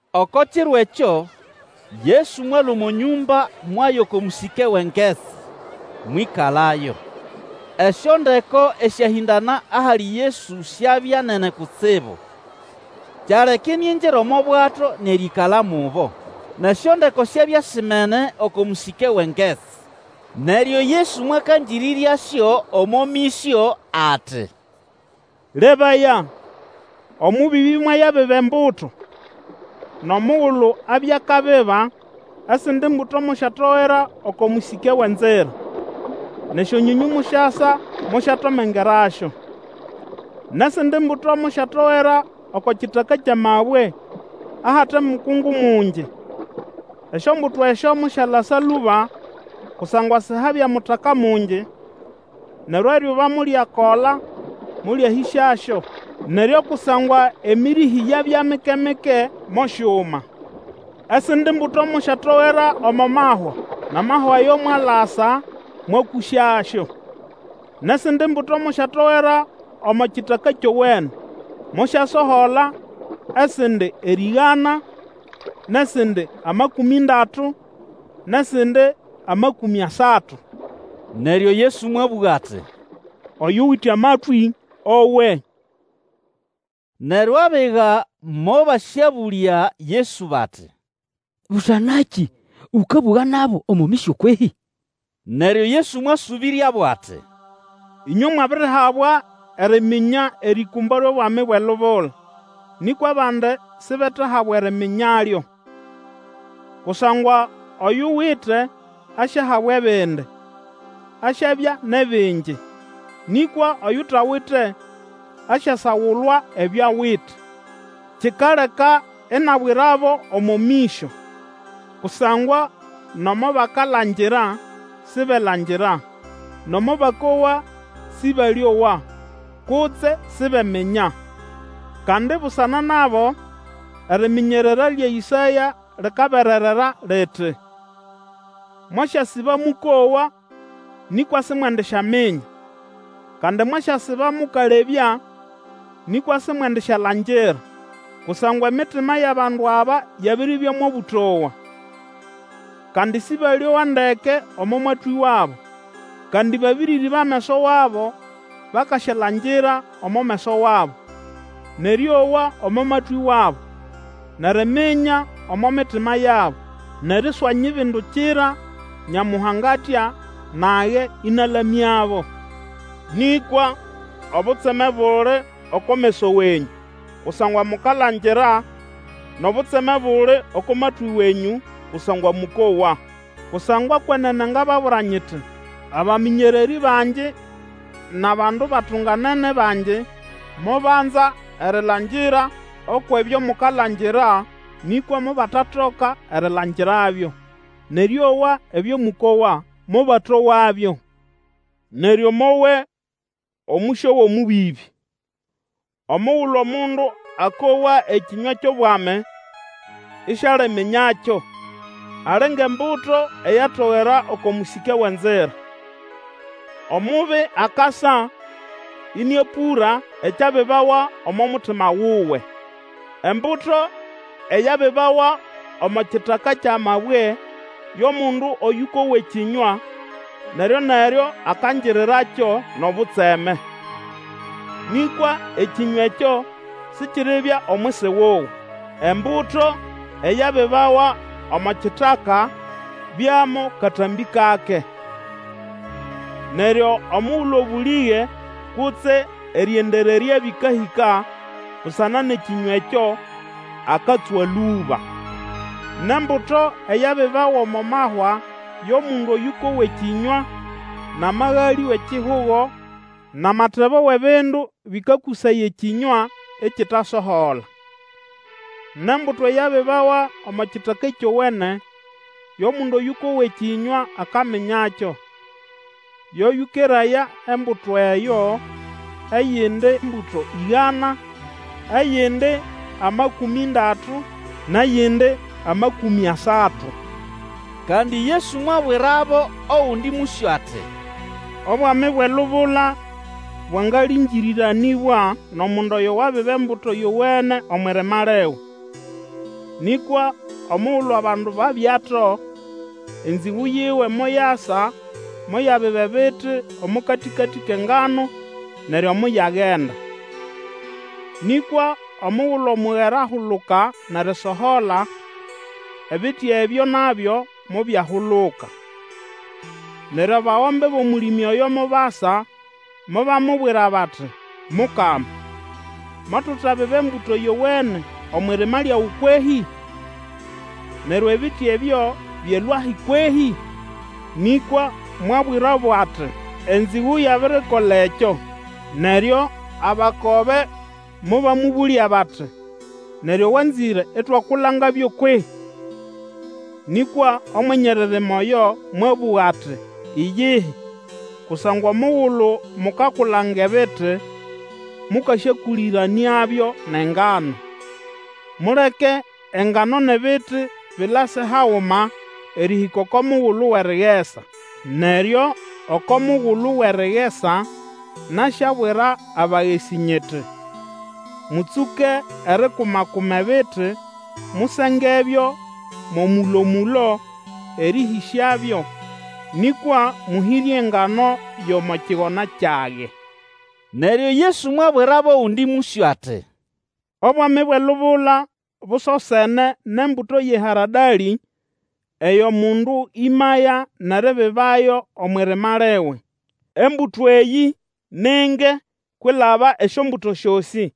Oko kiro ekyo Yesu mwalũa omo nyũmba mwaya oko mũsĩke wʼengetsi, mwĩkalayo. Esyondeko esyahĩndana ahali Yesu syabya nene kutsibu, kyaleka iniingira omo bwato nʼerĩĩkala mubo. Nʼesyondeko syabya simene oko mũsĩke wʼengetsi. Neryo Yesu mwakangĩrĩryasyo omo mĩsyo, ati, Lebaya, omũbĩbĩ mwayabiba embuto. Nʼomugulu abiba, esindi mbuto mosyatogera oko mũsĩke wʼenzira, nʼesyonyonyũ mosyasa mosyatomengerasyo. Nʼesindi mbuto mosyatogera oko kitaka kyʼamabwe, ahate mukungu mungi. Esyombuto esyo mosyalasa lũba, kusangwa sihabya mutaka mungi. Neryo eryuba molyakola, molyahĩsyasyo, neryo kusangwa emĩrĩhĩ yabya mike-mike, mosyuma. Esindi mbuto mosyatogera omo mahwa, nʼamahwa ayo mwalasa, mwakũsyasyo. Nʼesindi mbuto mosyatogera omo kitaka kyowene, mosyasohola, esindi erĩgana, nʼesindi amakũmĩ ndatu, nʼesindi amakũmĩ asatu. Neryo Yesu mwabũga ati, Oyuwite amatwĩ, owe! Neryo abiga mobasyabũlya Yesu bati, Busana nakĩ ũkabũga nabo omo mĩsyo kwehĩ? Neryo Yesu mwasũbĩryabo ati, Ĩnywe mwabirihabwa eriminya erĩkũmbo lyʼobwami bwʼelubula, nĩkwa abandi sibetahabwa eriminyalyo. Kusangwa oyuwite asyahabwa ebindi, asyabya nʼebingi; nĩkwa oyutawite, asyasagulwa ebyo awite. Kikaleka inabwirabo omo mĩsyo, kusangwa nomo bakalangira sibelangira, nomo bakowa Sĩbalĩowa, kutse sibeminya. Kandi busana nabo eriminyerera lya Ĩsaya likabererera, liti, Mwasyasiba mũkowa, nĩkwa simwendisyaminya; Kandi mwasyasiba mũkalebya, nĩkwa simwendisyalangira; Kusangwa emitima yʼabandu aba yabiribya mʼobũtowa, Kandi Sĩbalĩowa ndeke omo matwĩ wabo, Kandi babĩrĩrĩba ameso wabo; Bakasyalangira omo meso wabo, Nʼerĩowa omo matwĩ wabo, Nʼeriminya omo mitima yabo nʼeriswanyibindukira, Nyamuhanga atya, Nage ĩnalamyabo. Nĩkwa obutseme buli oko meso wenyũ, kusangwa mukalangira, nʼobutseme buli oko matwĩ wenyũ, kusangwa mũkowa. Kusangwa kwenene ngababwira nyiti, Abamĩnyererĩ bangi nʼabandu batunganene bangi mobanza erilangira oko ebyo mukalangira, nĩkwa mobatatoka erilangirabyo; nʼerĩowa ebyo mũkowa, mobatowabyo. Neryo mowe omũsyo wʼomũbĩbĩ. Omugulu omundu akowa ekĩnywa kyʼobwami, isialiminyakyo, ali ngʼembuto eyatogera oko mũsĩke wʼenzira. Omubi akasa ĩnĩapũra ekyabibawa omo mutima wuwe. Embuto e yabibawa omo kitaka kyʼamabwe yo mundu oyũkowa ekĩnywa, neryo-neryo akangirirakyo nʼobutseme. Nĩkwa ekĩnywa ekyo sikiribya omwisi wuwe. Embuto eyabibawa omo kitaka byamo katambĩ kake. Neryo omugulu obũlĩge, kutse erĩendererya bĩkahĩka busana nʼekĩnywa ekyo, akatswa lũba. Nʼembuto eyabibawa omo mahwa yo mundu oyũkowa ekĩnywa, nʼamagalĩ wʼekihugo, nʼamatebo wʼebindu bĩkakũsaya ekĩnywa, ikitasohola. Nʼembuto eyabibawa omo kitaka kyowene, yo mundu oyũkowa ekĩnywa akaminyakyo; yo yũkeraya embuto eyo, eyindi mbuto ĩgana, eyindi amakũmĩ ndatu, nʼeyindi amakũmĩ asatu. Kandi Yesu mwabwirabo ogundi mũsyo ati, Obwami bwʼelubula bwangalĩngĩrĩranĩbwa nʼomundu oyo wabiba embuto yowene omwʼirima liwe. Nĩkwa omugulu abandu babyato, enzĩgũ yiwe moyasa, moyabiba ebiti omo katĩkatĩ kʼengano, neryo moyagenda. Nĩkwa omugulu omugera ahuluka nʼerisohola, ebiti ebyo nabyo mobyahuluka. Neryo abagombe bʼomũlĩmĩ oyo mobasa mobamubwira bati, Mukama, mutabiba embuto yowene omwʼirima lyawe kwehĩ? Neryo ebiti ebyo byalũahi kwehĩ? Nĩkwa mwabwirabo ati, Enzĩgũ yabirikola ekyo! Neryo abakobe mobamũbũlya bati, Neryo wanzĩre itwakulangabyo kwehĩ? Nĩkwa Omwenye eririma oyo mwabũga ati, Iyihi; kusangwa omugulu mukakulanga ebiti, mũkasyakũlĩranĩabyo nʼengano. Muleke engano nʼebiti bilase haguma erĩhĩka oko mugulu wʼerigesa. Neryo oko mugulu wʼerigesa nasyabwira abagesĩ nyiti, Mũtsũke erikuma-kuma ebiti, musengebyo mo mũlo-mũlo erĩlũsyabyo; nĩkwa mũhĩre engano yʼomo kigona kyage. Neryo Yesu mwabwirabo ogundi mũsyo ati, Obwami bwʼelubula busosene nʼembuto yʼeharadalĩ eyo mundu ĩmaya nʼeribibayo omwʼirima liwe. Embuto eyĩ ni nge kwilaba esyombuto syosĩ,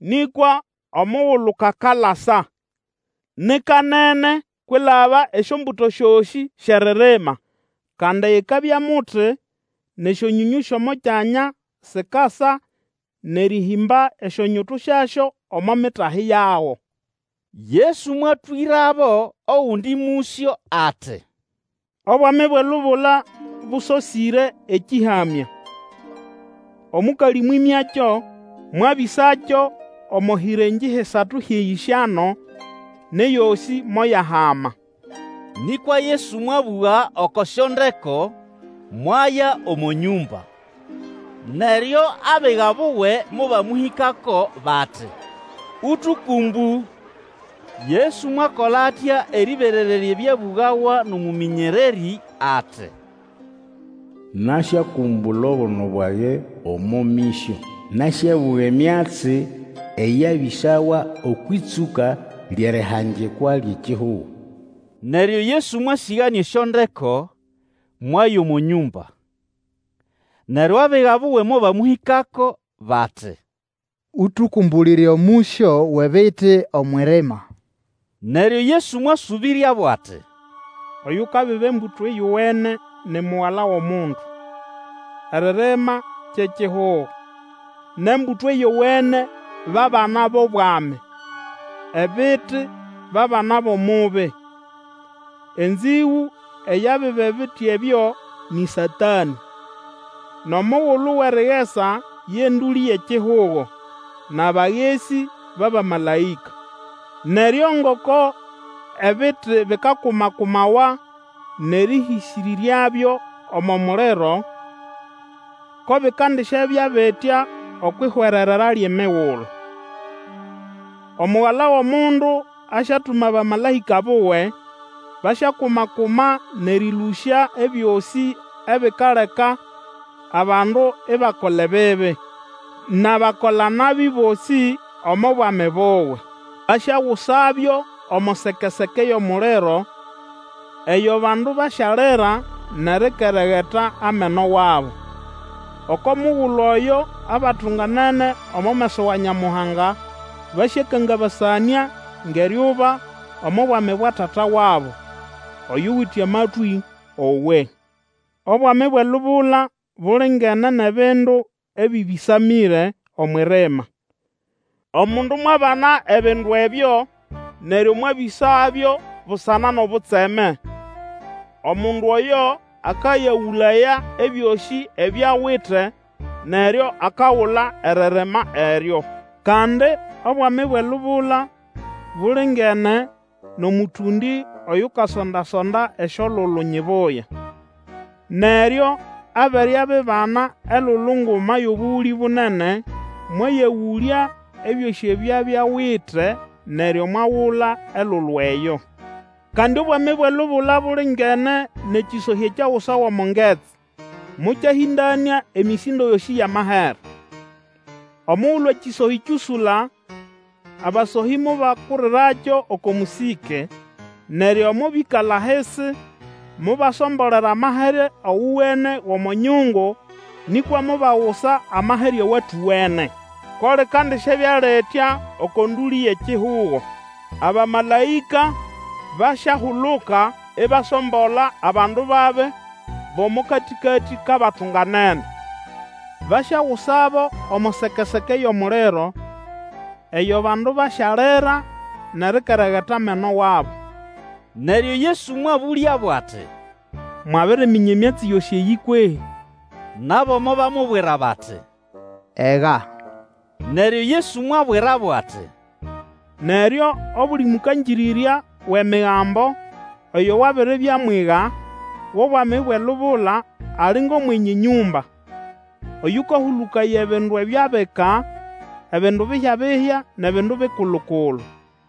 nĩkwa omugulu kakalasa, ni kanene kwilaba esyombuto syosĩ syʼeririma, kandi ikabya muti, nʼesyonyonyũ syʼomo kyanya sikasa nʼerĩhĩmba esyonyutu syasyo omo mitahi yago. Yesu mwatwĩrabo ogundi mũsyo ati, Obwami bwʼelubula bũsosĩre ekĩhamya. Omũkalĩ mwĩmyakyo, mwabĩsakyo omo hĩrengĩ hisatu hyʼeyĩsyano, nʼeyosĩ moyahama. Nĩkwa Yesu mwabũga oko syondeko, mwaya omo nyũmba. Neryo abiga buwe mobamũhĩkako bati, Ũtũkũmbũ: Yesu mwakola atya erĩberererya ebyabũgawa nʼomũmĩnyererĩ ati, Nasyakũmbũla obuno bwage omo mĩsyo; Nasyabũga emyatsi eyabĩsawa okwʼĩtsũka lyʼerihangikwa lyʼekihugo. Neryo Yesu mwasĩganĩa esyondeko, mwaya omo nyũmba. Neryo abiga buwe mobamũhĩkako bati, Ũtũkũmbũlĩre omũsyo wʼebiti omwʼirima. Neryo Yesu mwasũbĩryabo ati, Oyukabiba embuto yowene ni Mugala wʼomundu. Eririma kye kihugo; nʼembuto yowene ba bana bʼobwami; ebiti ba bana bʼOmubi. Enzigũ eyabiba ebiti ebyo nĩ Satanĩ. Nʼomugulu wʼerigesa ye ndũlĩ yʼekihugo, nʼabagesĩ ba bamalaĩka. Neryo ngoko ebiti bikakuma-kumawa nʼerĩhĩsĩrĩryabyo omo muliro, ko bikandisyabya bitya okwʼihwererera lyʼemigulu. Omugala wʼomundu asyatuma abamalaĩka buwe, basyakuma-kuma nʼerĩlũsya ebyosĩ ebikaleka abandu ibakola ebibi, nʼabakola-nabi bosĩ omo Bwami buwe, asyagusabyo omo seke-seke yʼomuliro, eyo abandu basyalira nʼerikeregeta ameno wabo. Oko mugulu oyo abatunganene omo meso wa Nyamuhanga basyakangabasanĩa ngʼeryuba omo Bwami bwa Tata wabo. Oyuwite amatwĩ owe! Obwami bwʼelubula bulingene nʼebindu ebĩbĩsamĩre omwʼirima. Omundu mwabana ebindu ebyo neryo mwabĩsabyo Busana nʼobutseme, omundu oyo akayagũlaya ebyosĩ ebyo awite, neryo akagula eririma eryo. Kandi, Obwami bwʼelubula bulingene nʼomũtũndĩ oyukasonda-sonda esyolulu nyibuya. Neryo abere abibana elulu nguma yʼobũgũlĩ bunene, mwayagũlya ebyosĩ ebyo abya awite neryo mwagula elulu eyo. Kandi Obwami bwʼelubula bulingene nʼekĩsohĩ ekyagusawa omo ngetsi, mokyahĩndanĩa emĩsĩndo yosĩ yʼamahere. Omugulu ekĩsohĩ kyũsũla, abasohĩ mobakurirakyo oko mũsĩke, neryo mobĩkala ahisi, mobasombolera amahere owene gʼomo nyungu, nĩkwa mobagusa amahere awatowene. Ko likandisyabya litya oko ndũlĩ yʼekihugo. Abamalaĩka basyahuluka ibasombola abandu babi bʼomo katĩkatĩ kʼabatunganene. Basyagusabo omo seke-seke yʼomuliro. Eyo abandu basyalira nʼerikeregeta ameno wabo. Neryo Yesu mwabũlyabo ati, Mwabiriminya emyatsi yosĩ eyĩ kwehĩ? Nabo mobamubwira bati, Ega. Neryo Yesu mwabwirabo ati, Neryo obuli mũkangĩrĩrya wʼEmigambo oyo wabiribya mwiga wʼobwami bwʼelubula ali ngʼomwenye nyũmba, oyũkahũlũkaya ebindu ebyo abika, ebindu bihya-bihya nʼebindu bikulu-kulu.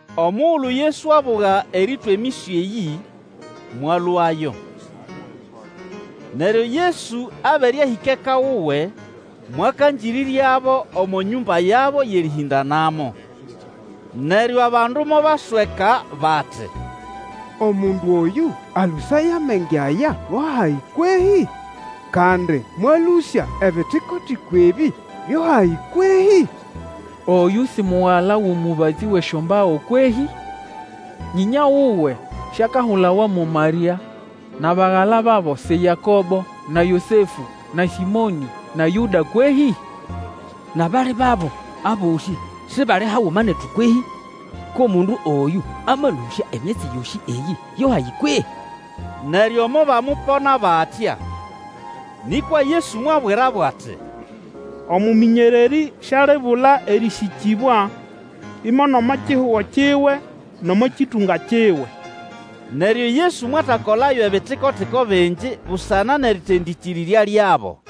Omugulu Yesu abuga erĩtwa emĩsyo eyĩ, mwalũayo. Neryo Yesu abere ahĩka eka wuwe, mwakangĩrĩryabo omo nyũmba yabo yʼerĩhĩndanamo. Neryo abandu mobasweka bati, Omundu oyũ alũsaya amenge aya go hahi kwehĩ? Kandi mwalũsya ebitiko-tiko ebĩ byo hahi kwehĩ? Oyũ si mugala wʼomũbatsĩ wʼesyombago kwehĩ? Nyĩnya wuwe siakahulawa mo Marĩa, nʼabagala babo si Yakobo, na Yosefũ, na Sĩmonĩ, na Yũda kwehĩ? Nʼabali babo, abosĩ sibali haguma netu kwehĩ? Ko mundu oyũ amalũsya emyatsi yosĩ eyĩ yo hahi kwehĩ? Neryo mobamupona batya. Nĩkwa Yesu mwabwirabo ati, Omũmĩnyererĩ sialibula erĩsĩkĩbwa, imo nʼomo kihugo kiwe nʼomo kĩtũnga kiwe. Neryo Yesu mwatakolayo ebitiko-tiko bingi busana nʼeritendĩkĩrĩrya lyabo.